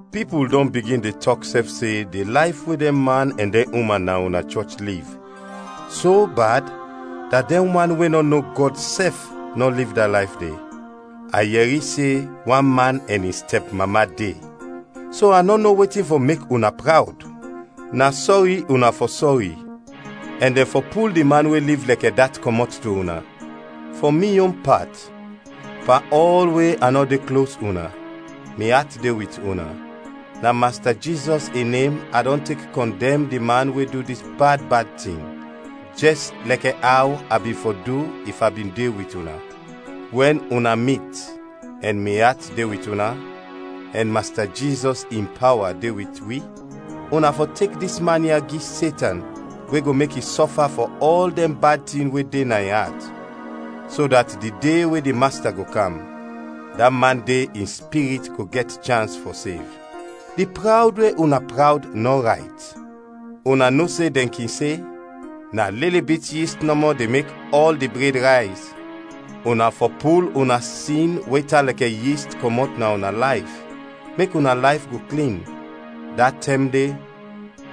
Pipul dɔn bigin de tɔk sɛf se di layf we dɛn man ɛn dɛn uman na una chɔch liv, so bad dat dɛn wan we nɔ no Gɔd sɛf nɔ liv da layf de; a yɛri se wan man ɛn in stɛpmama de. So a nɔ no wetin fɔ mek una prawd. Na sɔri una fɔ sɔri, ɛn dɛn fɔ pul di man we liv lɛkɛ dat kɔmɔt to una. Fɔ mi yon pat, pan ɔl we a nɔ de klos una, mi at de wit una; na Masta Jizɔs in nem a dɔn tek kɔndɛm di man we du dis bad bad tin, jɛs lɛkɛ aw a bin fɔ du if a bin de wit una. Wɛn una mit ɛn mi at de wit una, ɛn Masta Jizɔs in pawa de wit wi, una fɔ tek dis man ya gi Setan we go mek i sɔfa fɔ ɔl dɛn bad tin we de na in at, so dat di de we di Masta go kam, da man de in spirit go gɛt chans fɔ sev. Di prawd we una prawd nɔ rayt! Una no se dɛn kin se, “Na lili bit yist nɔmɔ de mek ɔl di bred rayz.” Una fɔ pul una sin we tan lɛkɛ yist kɔmɔt na una layf, mek una layf go klin. Da tɛm de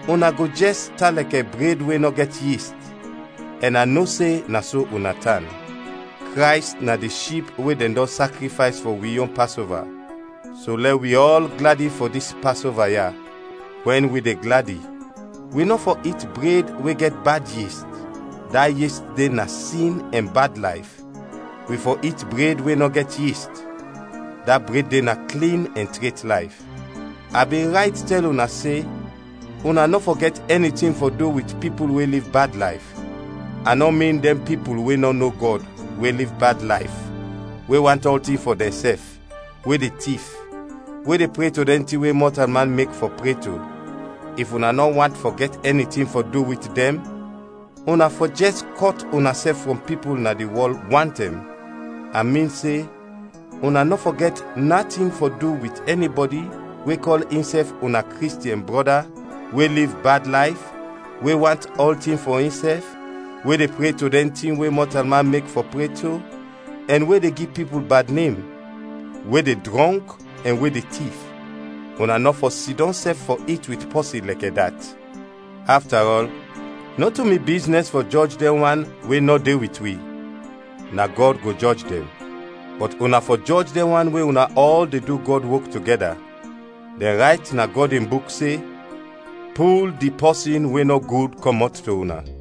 una go jɛs tan lɛkɛ bred we nɔ gɛt yist, ɛn a no se na so una tan. Krays na di ship we dɛn dɔn sakrifays fɔ wi yon Pasova. So lɛ wi ɔl gladi fɔ dis Pasova ya. Wɛn wi de gladi, wi nɔ fɔ it bred we gɛt bad yist, da yist de na sin ɛn bad layf, wi fɔ it bred we nɔ gɛt yist, da bred de na klin ɛn tret layf. A bin rayt tɛl una se, una nɔ fɔ gɛt ɛni tin fɔ du wit pipul we liv bad layf. A nɔ min dɛn pipul we nɔ no Gɔd, we liv bad layf, we want ɔltin fɔ dɛnsɛf, we de tif, we de pre to dɛn tin we mɔtalman mek fɔ pre to. If una nɔ want fɔ gɛt ɛni tin fɔ du wit dɛn, una fɔ jɛs kɔt unasɛf frɔm pipul na di wɔl wantɛm! A min se una nɔ fɔ gɛt natin fɔ du wit ɛnibɔdi we kɔl insɛf una Kristiɛn brɔda, we liv bad layf, we want ɔltin fɔ insɛf, we de pre to dɛn tin we mɔtalman mek fɔ pre to, ɛn we de gi pipul bad nem; we de drɔnk ɛn we de tif. Una nɔ fɔ sidɔm sɛf fɔ it wit pɔsin lɛkɛ dat. Afta ɔl, nɔto mi biznɛs fɔ jɔj dɛn wan we nɔ de wit wi. Na Gɔd go jɔj dɛn. Bɔt una fɔ jɔj dɛn wan we una ɔl de du Gɔd wok togɛda. Dɛn rayt na Gɔd in Buk se, “Pul di pɔsin we nɔ gud kɔmɔt to una.”